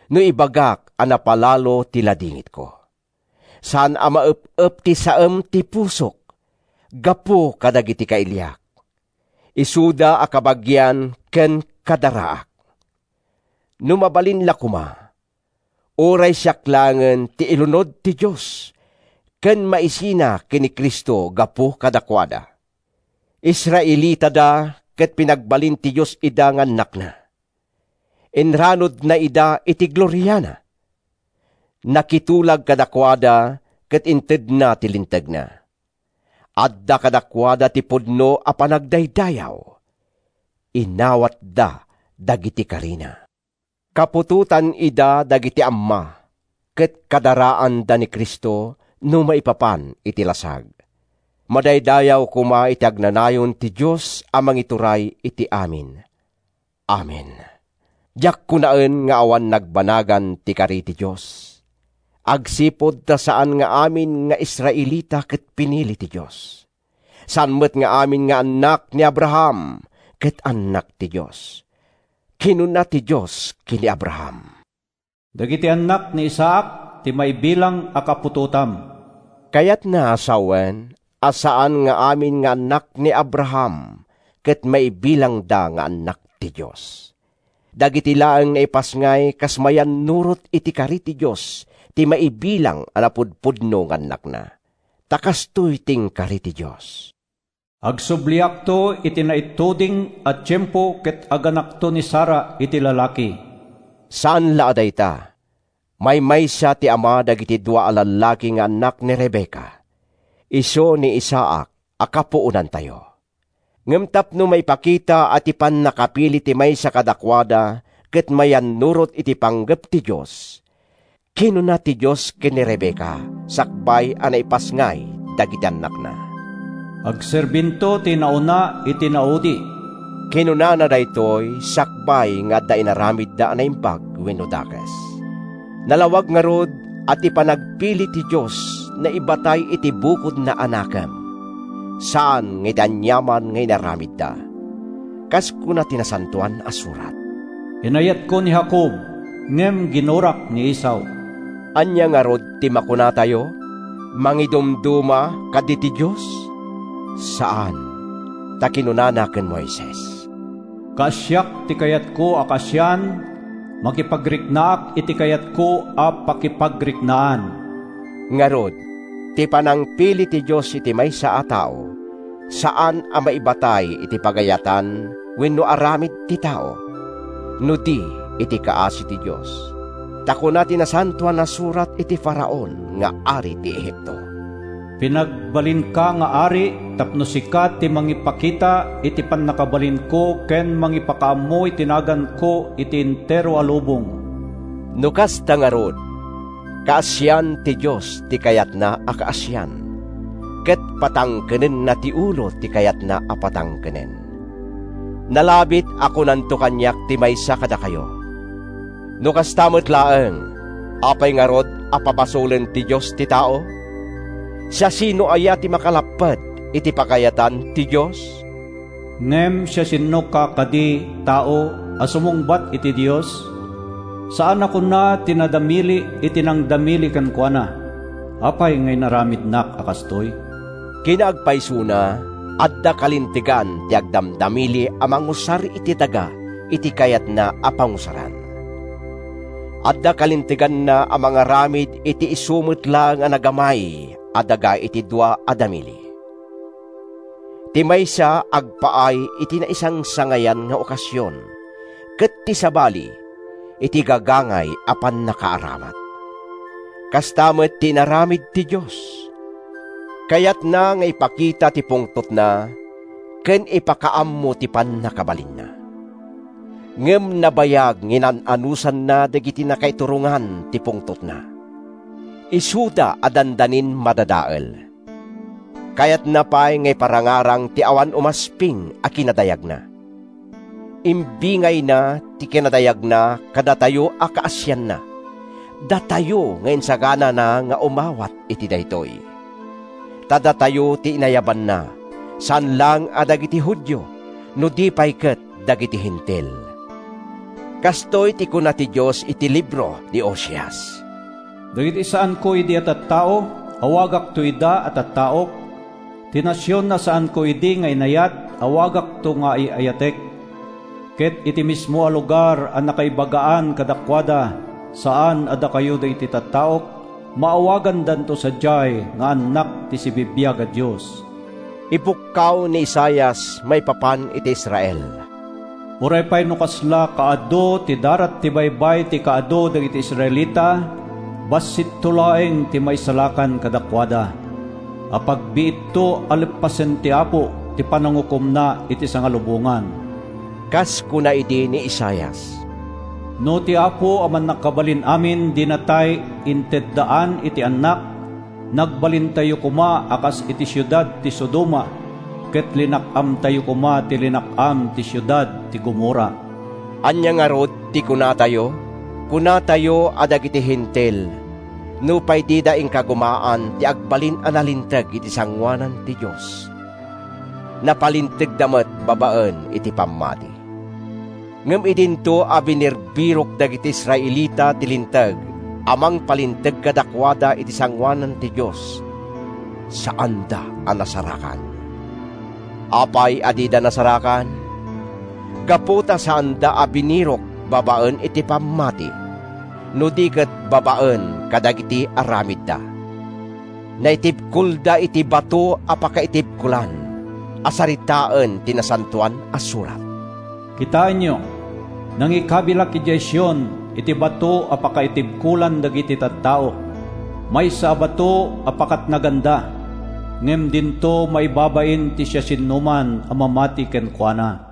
no ibagak a napalalo ti ladingitko. Saan a maep-ep ti saem ti pusok gapu kadagiti kailiak, isuda a kabagian ken kadaraak! No mabalin la koma, uray siak laengen ti ilunod ti Dios ken maisina ken ni Cristo gapu kadakuada. Israelitada, ket pinagbalin ti Dios ida nga annakna. Inranudna ida iti gloriana. Nakitulag kadakuada ket intedna ti Lintegna. Adda kadakuada ti pudno a panagdaydayaw. Inawatda dagiti karina. Kaputotan ida dagiti amma, ket kadaraanda ni Cristo no maipapan iti lasag. Madaydayaw koma iti agnanayon ti Dios a mangituray iti amin! Amen. Diak kunaen nga awan nagbanagan ti kari ti Dios, agsipud ta saan nga amin nga Israelita ket pinili ti Dios. Saan met nga amin nga annak ni Abraham ket annak ti Dios. Kinuna ti Dios ken ni Abraham, “Dagiti annak ni Isaac ti maibilang a kaputotam.” Kayatna a sawen a saan nga amin nga annak ni Abraham ket maibilangda nga annak ti Dios. Dagiti laeng naipasngay kas mayannurot iti kari ti Dios ti maibilang a napudpudno nga annakna. Ta kastoy ti inkari ti Dios: “Agsubliakto iti naituding a tiempo ket aganakto ni Sara iti lalaki.” Saan la a dayta. Maymaysa ti ama dagiti dua a lallaki nga annak ni Rebecca—isu ni Isaac a kapuonantayo. Ngem tapno maipakita a ti pannakapili ti maysa kadakuada ket mayannurot iti panggep ti Dios, kinuna ti Dios ken ni Rebecca sakbay a naipasngay dagiti annakna, “Agserbinto ti inauna iti inaudi.” Kinunana daytoy sakbay nga adda inaramidda a naimbag wenno dakes. Nalawag ngarud a ti panagpili ti Dios naibatay iti bukodna a nakem, saan nga iti aniaman nga inaramidda. Kas kuna ti Nasantoan a Surat, “Inayatko ni Jacob, ngem ginurak ni Esau.” Ania ngarud ti makunatayo? Mangidumduma kadi ti Dios? Saan! Ta kinunana ken Moises, “Kaasiak ti kayatko a kaasian, makipagriknaak iti kayatko a pakipagriknaan.” Ngarud, ti panangpili ti Dios iti maysa a tao saan a maibatay iti pagayatan wenno aramid ti tao, no di iti kaasi ti Dios. Ta kuna ti Nasantoan a Surat iti Faraon nga ari ti Egipto, “Pinagbalinka nga ari tapno sika ti mangipakita iti pannakabalinko ken mangipakaammo iti naganko iti entero a lubong.” No kasta ngarud, kaasian ti Dios ti kayatna a kaasian, ket patangkenenna ti ulo ti kayatna a patangkenen. Nalabit a kunanto kaniak ti maysa kadakayo, “No kasta met laeng, apay ngarud a pabasolen ti Dios ti tao? Siasino aya ti makalapped iti pagayatan ti Dios?” Ngem siasinoka kadi, tao, a sumungbat iti Dios? Saan a kuna ti nadamili iti nangdamili kenkuana, “Apay nga inaramidnak a kastoy?” Kinaagpaysona, adda kalintegan ti agdamdamili a mangusar iti daga iti kayatna a pangusaran. Adda kalinteganna a mangaramid iti isu met laeng a nagamay a daga iti dua a damili: ti maysa agpaay iti naisangsangayan nga okasion, ket ti sabali, iti gagangay a pannakaaramat. Kasta met ti inaramid ti Dios. Kayatna nga ipakita ti pungtotna ken ipakaammo ti pannakabalinna. Ngem nabayag nga inan-anusanna dagiti nakaiturongan ti pungtotna, isuda a dandanin madadael. Kayatna pay nga iparangarang ti awan umasping a kinadayagna. Imbingayna ti kinadayagna kadatayo a kaasianna, datayo nga insaganana nga umawat iti daytoy. Ta datayo ti inayabanna, saan laeng a dagiti Judio, no di pay ket dagiti Hentil. Kastoy ti kuna ti Dios iti libro ni Oseas: “Dagiti saanko idi a tattao, awagakto ida a ‘Tattaok.’ Ti nasion a saanko idi nga inayat, awagakto ida nga ‘Ay-ayatek.’ Ket iti mismo a lugar a nakaibagaan kadakuada, ‘Saan a dakayo dagiti tattaok,’ maawagandanto sadiay nga annak ti sibibiag a Dios.” Ipukkaw ni Isaias maipapan iti Israel: “Uray pay no kasla kaa-du ti darat ti baybay ti kaadu dagiti Israelita, bassitto laeng ti maisalakan kadakuada. Apagbiitto a leppasen ti Apo ti panangukomna iti sangalubongan.” Kas kuna idi ni Isaias, “No ti Apo a Mannakabalin-amin dinatay inteddaan iti annak, nagbalintayo koma a kas iti siudad ti Sodoma, ket linak-amtayo koma ti linak-am ti siudad ti Gomorra.” Ania ngarud ti kunatayo? Kunatayo a dagiti Hentil, nupay dida inkagumaan ti agbalin a nalinteg iti sangoanan ti Dios, napalintegda met babaen iti pammati. Ngem idinto a binirbirok dagiti Israelita ti linteg a mangpalinteg kadakuada iti sangoanan ti Dios, saanda a nasarakan. Apay a dida nasarakan? Gapu ta saanda a binirok babaen iti pammati, no di ket babaen kadagiti aramidda. Naitibkolda iti “bato a pakaitibkolan” a saritaen ti Nasantoan a Surat: “Kitaenyo, nangikabilak idiay Sion iti bato a pakaitibkolan dagiti tattao, Maysa a bato a pakatnaganda. Ngem dinto maibabain ti siasinoman a mamati kenkuana.”